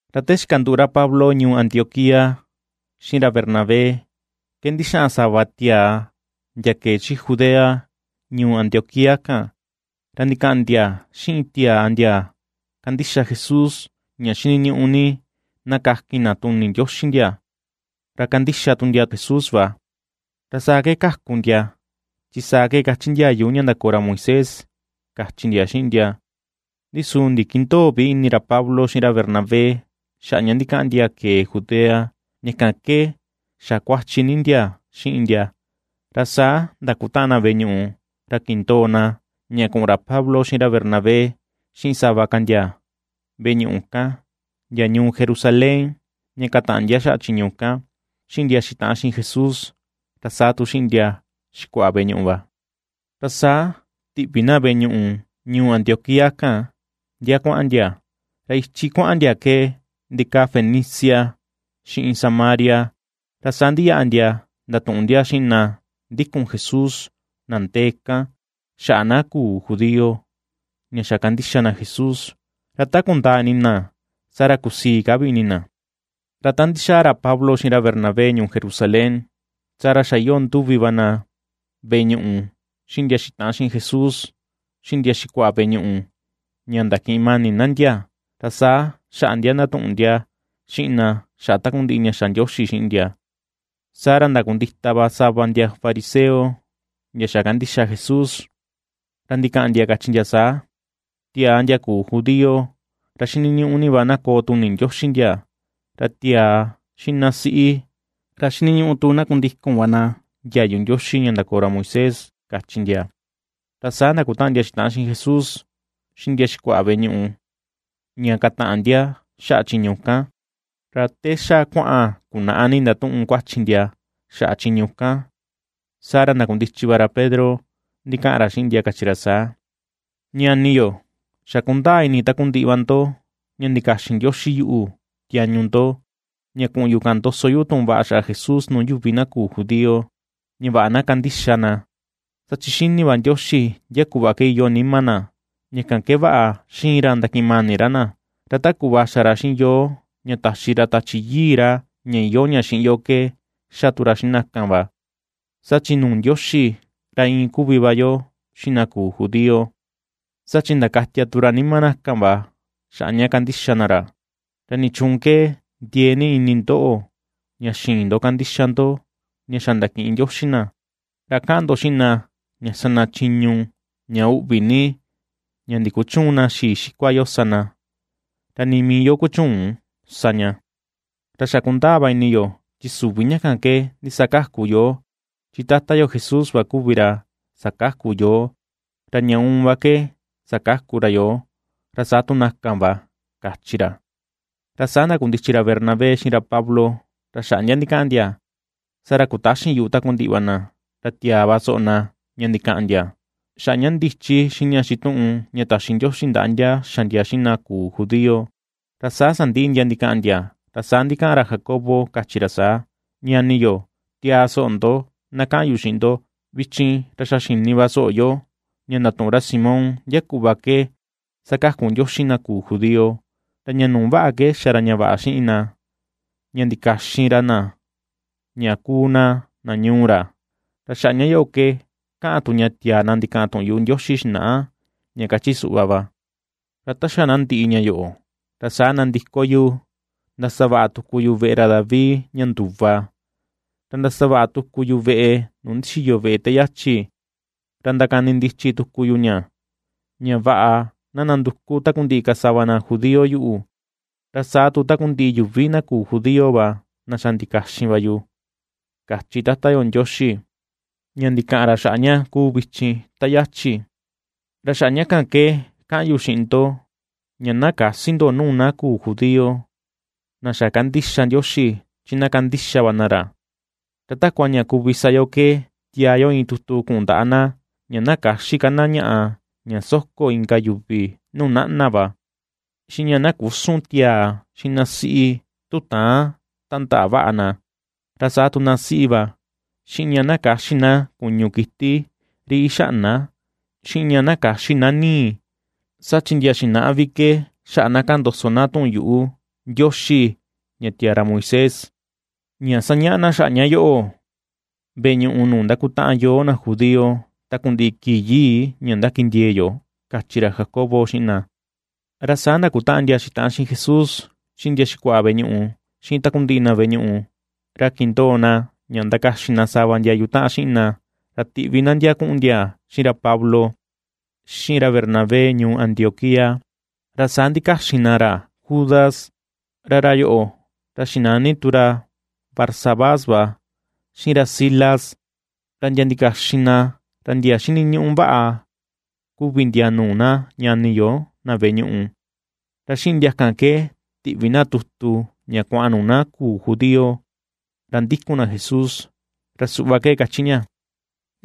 Ra te xikanduꞌu ra Pablo ñuu Antioquía xiꞌin ra Bernabé ke ndixaꞌan sava tiaa ndia kee chi Judea, ñuu Antioquía kan, ra ndikaꞌan ndia xiꞌin tiaa ndia kandixa Jesús ña xiniñuꞌu ni na kakin na tuni Ndioxi ndia, ra kandixa tu ndia Jesús va, ra saa ke kaku ndia, chi saa ke kachi ndiayu ña ndakoo ra Moisés, kachi ndia xiꞌin ndia. Ndi su ndikindöo vi ini ra Pablo xiꞌin ra Bernabé xaꞌa ña ndikaꞌan ndia kee Judea, ña kan ke xa kuachi ni ndia xiꞌin ndia, ra saa ndakutaꞌan na veꞌe ñuꞌu, ra kindoo na ña kuꞌun ra Pablo xiꞌin ra Bernabé xiꞌin sava ka ndia veꞌe ñuꞌu kan, ndia ñuu Jerusalén ña kataꞌan ndia xaꞌa chiñu kan, xiꞌin ndia xitaꞌan xiꞌin Jesús, ra saa tu xiꞌin ndia xikuaꞌa veꞌe ñuꞌu va. Ra saa tiꞌvi na veꞌe ñuꞌu ñuu Antioquía kan ndia kuaꞌan ndia; ra ichi kuaꞌan ndia ke ndikaa Fenicia xiꞌin Samaria, ra saa ndiyaꞌa ndia ndatuꞌun ndia xiꞌin na ndikun Jesús na ndee kan, xaꞌa na küu judío ña xa kandixa na Jesús. Ra ta kundaa ini na saa ra kusii ka vi ini na. Ra ta ndixaa ra Pablo xiꞌin ra Bernabé ñuu Jerusalén, saa ra xa iyoo nduvi va na veꞌe ñuꞌu, xiꞌin ndia xitaꞌan xiꞌin Jesús, xiꞌin ndia xikuaꞌa veꞌe ñuꞌu, ña ndakiꞌin mani na ndia, ra saa xaꞌa ndia ndatuꞌun ndia xiꞌin na xaꞌa takundiꞌi ña xa Ndioxi xiꞌin ndia. Saa ra ndakundita va sava ndia fariseo ndia xa kandixa Jesús, ra ndikaꞌan ndia kachi ndia saa: ―Tiaa ndia küu judío ra xiniñuꞌu ni va na koo tuni Ndioxi ndia, ra tiaa xiꞌin na siꞌi ra xiniñuꞌu tu na kundikun va na ndiayu Ndioxi ña ndakoo ra Moisés ―kachi ndia. Ra saa ndakutaꞌan ndia xitaꞌan xiꞌin Jesús, xiꞌin ndia xikuaꞌa veꞌe ñuꞌu, ña kataꞌan ndia xaꞌa chiñu kan. Ra te xa kuaꞌan kunaꞌa ni ndatuꞌun kuachi ndia xaꞌa chiñu kan, saa ra ndakundichi va ra Pedro ndikaꞌan ra xiꞌin ndia kachi ra saa: ―Ñani yo, xa kundaa ini takundiꞌi va ndo ña ndikaxin Ndioxi yuꞌu tiañu ndo, ña kuꞌun yu kaꞌan ndoso yu tuꞌun vaꞌa xaꞌa Jesús nuu yuvi na küu judío, ña vaꞌa na kandixa na. Saa chi xini va Ndioxi ndia kuꞌva ke iyoo nima na, ña kan ke vaꞌa xiin ra ndakiꞌin mani ra na, ra ta kuꞌva xa ra xiꞌin yoo ña taxi ra Tachi Yii ra, ña iyoo ña xiꞌin yo ke xa tu ra xiꞌin na kan va. Saa chi nuu Ndioxi ra iin kuvi va yo xiꞌin na küu judío. Saa chi ndakatia tu ra nima na kan va xaꞌa ña kandixa na ra. ¿Ra nichuun ke ndiee ni ini ndoꞌo, ña xïin ndo kandixa ndo ña xa ndakiꞌin Ndioxi na, ra kaꞌan ndo xiꞌin na, ña sa na chiñu ña uꞌvi ni ña ndikuchüun na xii xikua yo sa na, ra ni mii yo kuchüun sa ña? Ra xa kundaa va ini yo chi süvi ña kan ke ndisakaku yoo, chi Tata yo Jesús va kuvi ra sakaku yoo, ra ña uun va ke sakaku ra yoo, ra saa tu na kan va ―kachi ra. Ra saa ndakundichi ra Bernabé xiꞌin ra Pablo ra xaꞌa ndia ndikaꞌan ndia, saa ra kutaxin yuꞌu takundiꞌi va na, ra tiaa va soꞌo na ña ndikaꞌan ndia, xaꞌa ña ndichi xiꞌin ña xituꞌun ña taxi Ndioxi ndaꞌa ndia xa ndia xiꞌin na küu judío. Ra ta sandiꞌi ndia ndikaꞌan ndia, ra saa ndikaꞌan ra Jacobo, kachi ra saa: ―Ñani yo, tiaa soꞌo ndo, na kaꞌan yu xiꞌin ndo: Vichin, ra xa xini va soꞌo yo ña ndatuꞌun ra Simón ndia kuꞌva ke sakaku Ndioxi na küu judío; ra ña nuu va ke xa ra ña vaꞌa xiꞌin na, ña ndikaxin ra na ña kuu na, na ñuu ra. Ra xaꞌa ña yoꞌo ke kaꞌan tu ña tiaa na ndikaꞌan tuꞌun yuꞌu Ndioxi xinaꞌa, ña kachi suꞌva va: Ra ta xa na ndiꞌi ña yoꞌo, ra saa nandiko yu ndasavaꞌa tuku yu veꞌe ra David ña nduva, ra ndasavaꞌa tuku yu veꞌe nuu ndixiyo veꞌe te yachi, ra ndakanindichi tuku yu ña, ña vaꞌa na nanduku takundiꞌi ka sava na judío yuꞌu, ra saa tu takundiꞌi yuvi na küu judío va, na xa ndikaxin va yu, kachi Tata yo Ndioxi, ña ndikaꞌan ra xaꞌa ña kuu vichin ta yachi. ’Ra xaꞌa ña kan ke kaꞌan yu xiꞌin ndo ña na käsi yo nuu na küu judío, na xa kandixa Ndioxi, chi na kandixa va na ra. Ra takua ña kuvi sa yo ke tiaa yo iin tutu kuꞌun ndaꞌa na ña na käxi ka na ñaꞌa ña soko inka yuvi nuu naꞌna va, xiꞌin ña na küsun tiaa xiꞌin na siꞌi tu täan tandaꞌa vaꞌa na, ra saa tu na siꞌi va, xiꞌin ña na käxi na kuñu kiti ri ixaꞌna, xiꞌin ña na käxi na nii. Saa chi ndia xinaꞌa vi ke xaꞌa na kaꞌan ndoso tuꞌun yuꞌu Ndioxi ña tiaa ra Moisés, sañaꞌa na xaꞌa ña yoꞌo veꞌe ñuꞌu nuu ndakutaꞌan yoo na judío takundiꞌi kii yii ña ndakindiee yo ―kachi ra Jacobo xiꞌin na. Ra saa ndakutaꞌan ndia xitaꞌan xiꞌin Jesús, xiꞌin ndia xikuaꞌa veꞌe ñuꞌu, xiꞌin takundiꞌi na veꞌe ñuꞌu, ra kindoo na ña ndakaxin na sava ndia yutaꞌan xiꞌin na ra tiꞌvi na ndia kuꞌun ndia xiꞌin ra Pablo, xiꞌin ra Bernabé ñuu Antioquía. Ra saa ndikaxin na ra Judas, ra ra yoꞌo, ra xinani tu ra Barsabás va, xiꞌin ra Silas, ra ndia ndikaxin na ra ndia ^xiniñuꞌu vaꞌa kuvi ndia nuu na ñani yo na veꞌe ñuꞌu. Ra xiꞌin ndia kan ke tiꞌvi na tutu ña kuaꞌan nuu na küu judío, ra ndikun na Jesús, ra suꞌva ke kachi ña: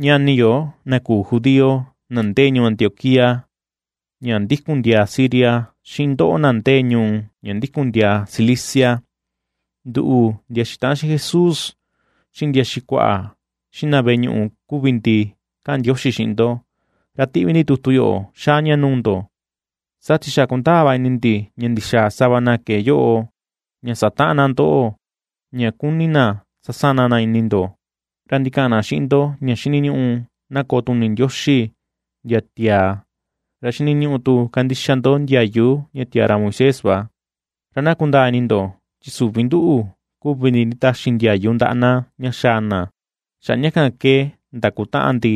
“Ñani yo, na küu judío, na ndee ñuu Antioquía ña ndikun ndiaa Siria, xiꞌin ndoꞌo na ndee ñuu ña ndikun ndiaa Cilicia, nduꞌu, ndia xitaꞌan xiꞌin Jesús, xiꞌin ndia xikuaꞌa, xiꞌin na veꞌe ñuꞌu kuvi ndi kaꞌan ndioxi xiꞌin ndo. Ra tiꞌvi ndi tutu yoꞌo xaa ña nuu ndo, saa chi xa kundaa va ini ndi ña ndixaa sava na kee yoꞌo, ña sataꞌan na ndoꞌo, ña kuni na sasana na ini ndo, ra ndikaꞌan na xiꞌin ndo ña xiniñuꞌu na koo tuni xini Ndioxi ndia tiaa, ra xiniñuꞌu tu kandixa ndo ndiayu ña tiaa ra Moisés va. Ra na kundaa ini ndo chi süvi nduꞌu kuvi ndi nditaxi ndiayu ndaꞌa na ña xaa na. Xaꞌa ña kan ke ndakutaꞌan ndi,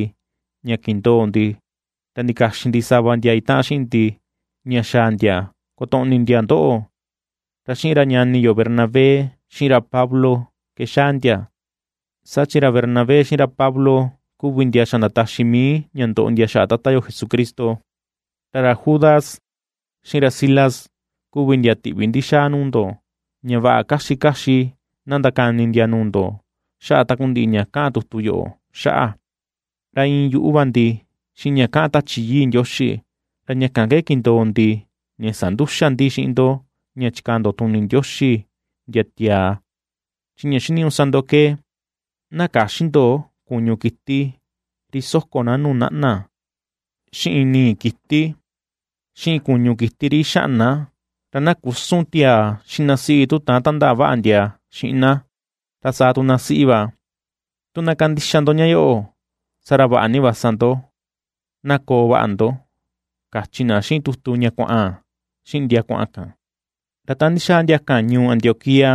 ña kindoo ndi, ra ndikaxin ndi sava ndia itaꞌan xiꞌin ndi ña xaa ndia kotoꞌni ndia ndoꞌo; ra xiꞌin ra ñani yo Bernabé, xiꞌin ra Pablo ke xaa ndia. Saa chi ra Bernabé xiꞌin ra Pablo kuvi ndia xa ndataxi mii ña ndoꞌo ndia xaꞌa Tata yo Jesucristo. Ra ra Judas, xiꞌin ra Silas kuvi ndia tiꞌvi ndi xaa nuu ndo, ña vaꞌa kaxi kaxi na ndakani ndia nuu ndo xaꞌa takundiꞌi ña kaꞌan tutu yoꞌo xaꞌa. Ra iin yuꞌu va ndi xiꞌin ña kaꞌan Tachi Yii Ndioxi, ra ña kan ke kindoo ndi ña sandüxa ndi xiꞌin ndo ña chikaa ndo tuni Ndioxi ndia tiaa, chi ña xiniñuꞌu sa ndo ke: na käxi ndo kuñu kiti ri soko na nuu naꞌna, xiꞌin nii kiti, xiꞌin kuñu kiti ri ixaꞌna; ra na küsun tiaa xiꞌin na siꞌi tu täan tandaꞌa vaꞌa ndia xiꞌin na, ra saa tu na siꞌi va. Tu na kandixa ndo ña yoꞌo, saa ra vaꞌa ni va sa ndo. Na koo vaꞌa ndo”, kachi na xiꞌin tutu ña kuaꞌan xiꞌin ndia kuaꞌan kan. Ra ta ndixaa ndia kan ñuu Antioquía,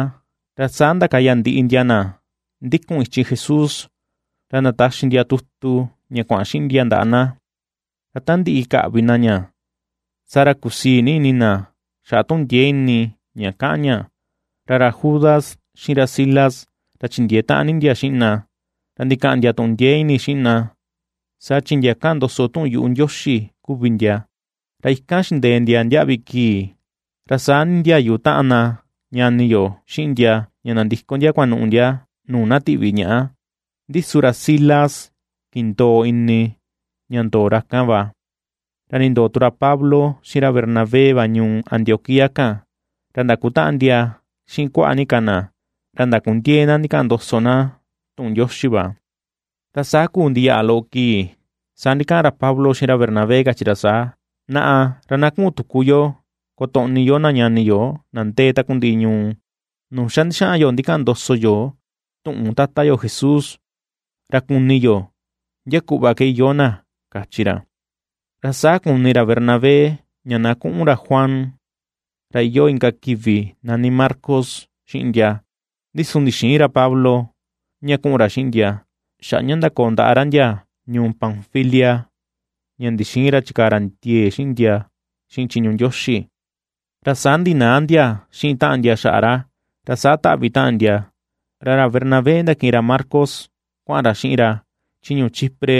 ra saa ndakaya ndia ndiꞌi na ndikun ichi Jesús ra ndataxi ndia tutu ña kuaꞌan xiꞌin ndia ndaꞌa na. Ra ta ndiꞌi kaꞌvi na ña, saa ra kusii nii ini na xaꞌa tuꞌun ndiee ini ña kaꞌan ña. Ra ra Judas xiꞌin ra Silas ra chindiee taꞌan ni ndia xiꞌin na, ra ndikaꞌan ndia tuꞌun ndiee ini xiꞌin na, saa chi ndia kaꞌan ndoso tu tuꞌun yuꞌu Ndioxi kuvi ndia. Ra ikan xindee ndia ndiaꞌvi kii, ra saa nindiayu taꞌan na ñani yo xiꞌin ndia ña nandiko ndia kunuꞌu ndia nuu na tiꞌvi ñaꞌa. Ndi su ra Silas kindoo ini ña ña ndoo ra kan va. Ra nindoo tu ra Pablo, xiꞌin ra Bernabé va ñuu Antioquía kan, ra ndakutaꞌan ndia xiꞌin kuaꞌa ni ka na, ra ndakundiee na ndikaꞌan ndoso na tuꞌun Ndioxi va. Ra saa kuu ndiyaꞌa loꞌo kii, saa ndikaꞌan ra Pablo xiꞌin ra Bernabé, kachi ra saa: ―Naꞌa, ra na kuꞌun tuku yo kotoꞌni yo na ñani yo na ndee takundiꞌi ñuu nuu xa ndixaꞌan yo ndikaꞌan ndoso yo tuꞌun Tata yo Jesús, ra kuni yo ndia kuꞌva ke iyoo na ―kachi ra. Ra saa kuni ra Bernabé ña na kuꞌun ra Juan, ra iyoo inka kivi nani Marcos, xiꞌin ndia; ndi su ndixïin ra Pablo, ña kuꞌun ra xiꞌin ndia, xaꞌa ña ndakoo ndaꞌa ra ndia ñuu Panfilia ña ndixïin ra chikaa ra ndiee xiꞌin ndia xiꞌin chiñu Ndioxi. Ra saa ndinaa ndia xiꞌin taꞌan ndia xaꞌa ra. Ra saa taꞌvi taꞌan ndia, ra ra Bernabé ndakiꞌin ra Marcos kuaꞌan ra xiꞌin ra chi ñuu Chipre,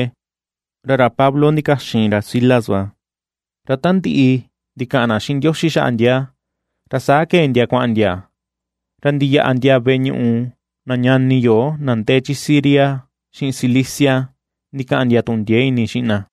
ra ra Pablo ndikaxin ra Silas va; ra ta ndiꞌi ndikaꞌan na xiꞌin Ndioxi xaꞌa ndia, ra saa kee ndia kuaꞌan ndia, ra ndiyaꞌa ndia veꞌe ñuꞌu na ñani yo na ndee chi Siria xiꞌin Cilicia ndikaꞌan ndia tuꞌun ndiee ini xiꞌin na.